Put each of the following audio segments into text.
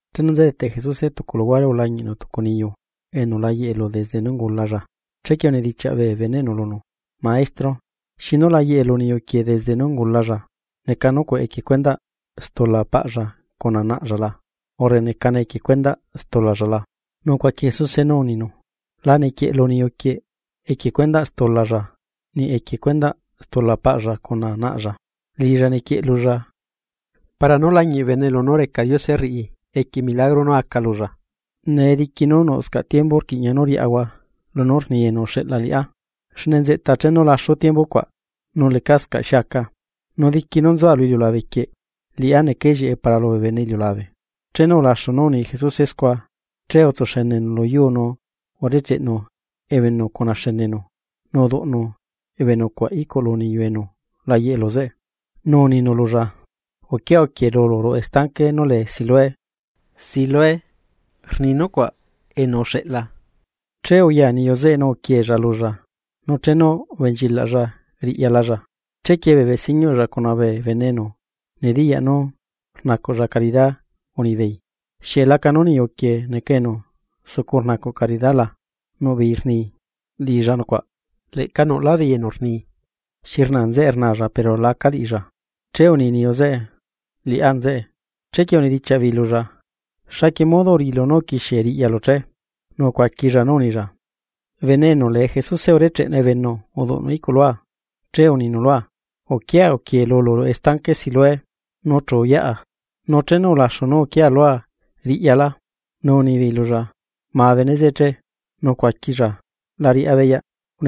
Chenu nzedete Jesuse tucu luhuare ulañiꞌnu tucu niyu enu la yeꞌe lu desde nú ungulalla. Chequie unedichiaꞌ bee beneꞌnu lunu: ―Maestro, ¿xinu layeꞌe lu niyu quieꞌ desde nú ungulalla? ¿Neca nucuaꞌ equie cuendaꞌ stula paꞌlla cuna naꞌlla la, urre necane equie cuendaꞌ stulalla la? Nu ucuaqui Jesuse nú uninu: ―La nequieꞌlu niyuquieꞌ equie cuendaꞌ stulalla, niꞌ equie cuendaꞌ stula paꞌlla cuna naꞌlla. Liꞌilla nequieꞌlulla para nú lañiꞌ bee bene lunú reca Diose rriꞌi equie milagro nú aca lulla. Nee diqui nú nuꞌscaꞌ tiembu, rquiꞌña nú riꞌahua lunú rni enu uxeꞌla liꞌá, xne nzeꞌta chenu laxu tiembu cuaꞌ, nú lecascaꞌ xi aca. Nu diqui nú nzua lu iliulabe quieꞌ, liꞌá neca ellieꞌe para lubee bene iliulabe. Chenu ulaxu nú uni Jesuse scua, chee utsuxenenu lu yuu nu urecheꞌnu ebenu cuna xenenu nu uduꞌnu ebenu cuaꞌ iꞌculu niyu enu la yeꞌe lu zeꞌe. Nu uninu lulla: ―Uquia uquiee lulu ruꞌu estanque nú lee Siloé ―Siloé, rni nucuaꞌ. Enu uxeꞌla. Che uya niyu zeꞌe nu uquiella lulla, nu chenu ubenchilaꞌlla riꞌyalalla. Chequie bee besiñuꞌlla cuna bee bene enu nediyaꞌ nú rnacuꞌlla caridá unibeei: ―¿Xieꞌ lacanu niyuquieꞌ neca enu sucu rnacuꞌ caridá la? Nuꞌ beei rni: ―Liꞌilla nucuaꞌ. Leꞌca nuꞌlá beei enu rni: ―Xi rnaa nzeꞌe rnaalla pero laca liꞌilla. Che uni niyu zeꞌe: ―Liꞌá nzeꞌe. Chequie unedichiaꞌ beei lulla: ―¿Xaquie modo uriꞌilu nú uquixie riꞌyalu che? Nu ucuaquilla nú unilla: ―Bene enu lee Jesuse urecheꞌenu ebenu uduꞌnu iꞌculua, che uninu lua: “Uquia uquie lulu ruꞌu estanque Siloé.” Nu chu uyaꞌa, nu chenu ulaxu nú uquiea lua riꞌyala. Nu unibeei lulla: ―¿Ma bene zeꞌe che? Nu ucuaquilla: ―La riꞌá beyaꞌ.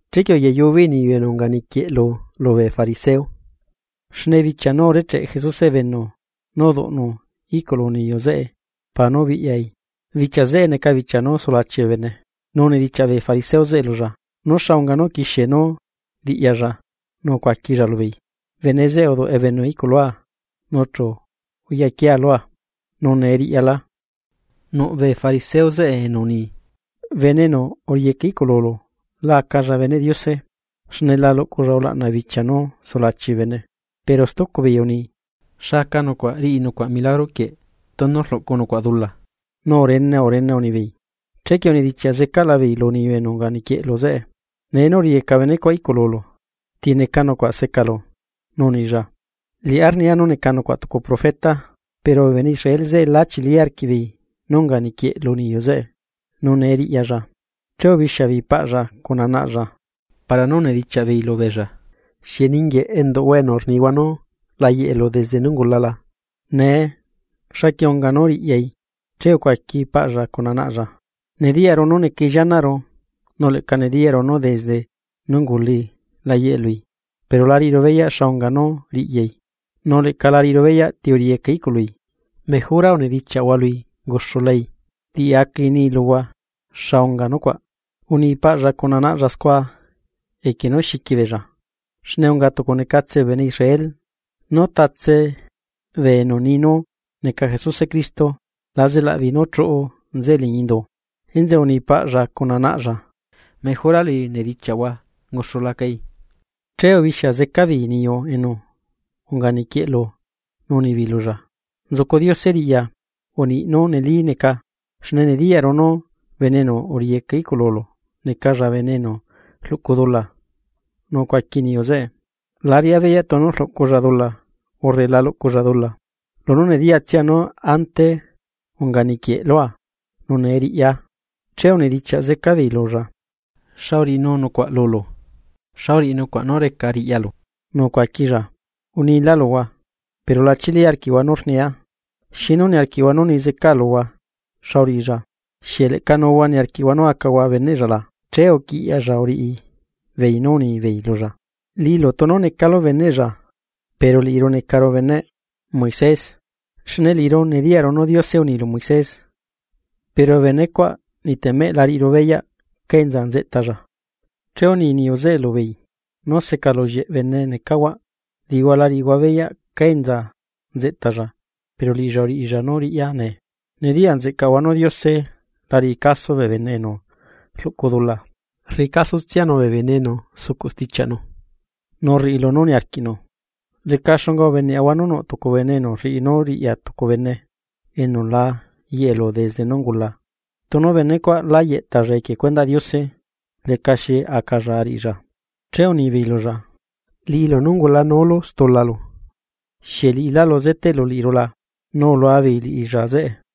Chequie uyayu beei niyu enu unga niquieꞌlu zeꞌe lubee fariseo. Xne bichia nú urecheꞌe Jesuse ebenu nu uduꞌnue iꞌculu niyu zeꞌe para nú ubiꞌyai. Bichia zeꞌe neca bichia nú sulachi bee bene. Nu unidichiaꞌ bee fariseo zeꞌe lulla, nú xa unga nú uquixie nú riꞌyalla nu ucuaquilla lubeei: ―Bene zeꞌe uduꞌ ebenu iꞌculua, nu chu uyaquiea lua, nu nee riꞌyalá. Nuꞌ bee fariseo zeꞌe enu uni: ―Bene enu uriꞌiyeca i'cululu la acalla beneꞌ Diose, xne la luꞌculla ulaꞌna bichia nú sulachi bee bene. Pero stucu beei uni: ―¿Xa aca nucuaꞌ riꞌi nucuaꞌ milagro quieꞌ tunu rluꞌcu nucuaꞌ dula? Nu urene urene unibeei. Chequie unidichiaꞌ zecaꞌla beei lu niyu enu unga niquieꞌlu zeꞌe: ―Nee nú uriꞌiyeca benecuaꞌ iꞌcululu, ¿ti neca nucuaꞌ secalu? Nu unilla: ―Liꞌá rnia nú neca nucuaꞌ tucu profeta. Pero bee bene Israel zeꞌe la chili arquiꞌbeei nú unga niquieꞌlu niyu zeꞌe, nu nee riꞌyalla. Che ubixia beei paꞌlla cuna naꞌlla, para nú unidichiaꞌ beei lubeella: ―¿Xieꞌ ninguieꞌ enduꞌhua enu rnihua nú la yeꞌelu desde nú ungula la? Nee, ¿xaquie unga nú riꞌyai? Chequie ucuaqui paꞌlla cuna naꞌlla: ―Nediyaꞌru nú necai llianaꞌru, nu leꞌca nediyaꞌru nú desde nú ungulai la yeꞌe lui. Pero la riꞌiru beyaꞌ xa unga nú riꞌyai, nu leꞌca la riꞌiru beyaꞌ ti uriꞌiyeca iꞌcului. Mejora unidichiaꞌhua lui unguxulacai, liꞌicai ixiuleꞌi luhua xa unga nucuaꞌ. Uni paꞌlla cuna naꞌlla scua, equie nú xiqui beella, xne unga tucu necatsela bee bene Israel nú tatse bee enu ni nú neca Jesuse Cristo, la zelaꞌbeei nú chuꞌu nzeꞌe liñi indu. Enzeꞌe uni paꞌlla cuna naꞌlla: “Mejora lui nedichiaꞌhua, unguxulacai.” Che ubixia zeca beei niyu enu unga niquieꞌlu nu unibeei lulla: ―Nzucu Diose riꞌya, uniꞌ nú neli neca, xne nediyaꞌru nú bene enu uriꞌiyeca iꞌcululu necalla bene enu rluꞌcu dula. Nu ucuaqui niyu zeꞌe: ―La riꞌá beyaꞌ tunu rluꞌculla dula, urre la luꞌculla dula, lunú nediyatsia nú ante unga niquieꞌlua nu nee riꞌya. Chequie unidichiaꞌ zeca beei lulla: ―¿Xa uriꞌinu nucuaꞌ lulu? ¿Xa uriꞌi nucuaꞌ nú reca riꞌyalu? Nu ucuaquilla: ―¿Unilá luhua, pero la chili arquiꞌhua nú rnia? ¿Xinu niarquiꞌhua nú ni zecaa luhua xa uriꞌilla? ¿Xieꞌ leꞌca nuhua niarquiꞌhua nú acahua beneꞌlla la? Che uquiꞌyaꞌlla uriꞌi beei nu unibeei lulla: ―Liꞌilu tunu necalu beneꞌlla. Pero liꞌiru necaru beneꞌ Moisés. Xne liꞌiru nediyaꞌru nú Diose uni lu Moisés. Pero benecuaꞌ niꞌtemeꞌ la riꞌiru beyaꞌ cá enza nzeꞌtalla. Che uni niyu zeꞌe lubeei: ―¡Nú secalullieꞌ bene necahuaꞌ! Liꞌihua la riꞌihua beyaꞌ cá enza nzeꞌtalla pero liꞌilla uriꞌilla nú riꞌya nee. Nediyaꞌ nzeꞌcaꞌhua nú Diose la riꞌi caso bee bene enu rluꞌcu dula, rriꞌi casotsianu bee bene enu sucuꞌ stichiaꞌnu nu rriꞌi lunú niarquiꞌnu. Leca xunga ubeneꞌahua nú nuꞌ tucu bene enu rriꞌi nú riꞌya tucu bene enu la yeꞌelu desde nú ungula. Tunu benecuaꞌ la yeꞌtalla equie cuendaꞌ Diose. Lecaxi acalla ariꞌilla. Che unibeei lulla: ―Liꞌilu nú ungulanúlu stulalu, ¿xieꞌ liꞌilálu zeteꞌlu liꞌiru la? Nu ulua beei liꞌilla zeꞌe.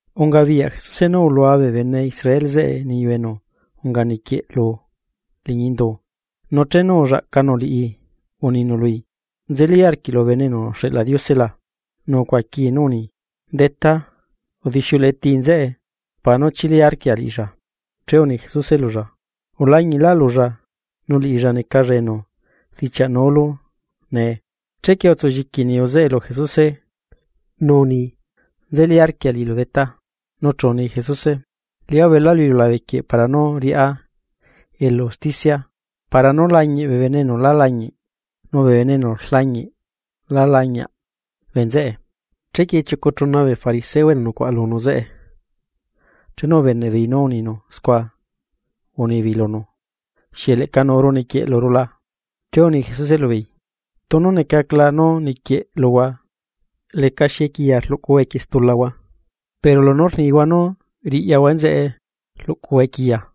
Ungabiyaꞌ Jesuse nú ulua bee bene Israel zeꞌe niyu enu unga niquieꞌlu liñi indu, nu chenu ullaꞌcanu liꞌi uninu lui: ―¿Nzelí arquiꞌlu Bene enu uxeꞌla Diose la? Nu ucuaquii nú uni: ―Detá, udixiuleꞌe tii nzeꞌe para nú chili arquia liꞌilla. Che uni Jesuse lulla: ―Ulañiꞌlaꞌlulla, nu liꞌilla necalla enu rdichiaꞌnulu nee. Chequie utsulliqui niyu zeꞌe lu Jesuse, nu uni: ―Nzelí arquia liꞌilu Detá. Nu chu uni Jesuse: ―Liꞌá ubela lu iliulabe quieꞌ para nú riꞌá elu usticia, para nú lañiꞌ bee bene enu la lañiꞌ, nu bee enu rlañiꞌ la lañiaꞌ bee nzeꞌe. Chequie chiucu chuna bee fariseo enu nucuaꞌa lunu zeꞌe, chenu ubeneꞌ beei nú uninu scua, unibeei lunu: ―¿Xieꞌ leꞌca nuuru niquieꞌluru la? Che uni Jesuse lubeei: ―Tunu necacla nú niquieꞌluhua, lecaxi equiya rluꞌcuhua equie stulahua. Pero lunú rnihua nú riꞌyahua enzeꞌe rluꞌcuhua equiya.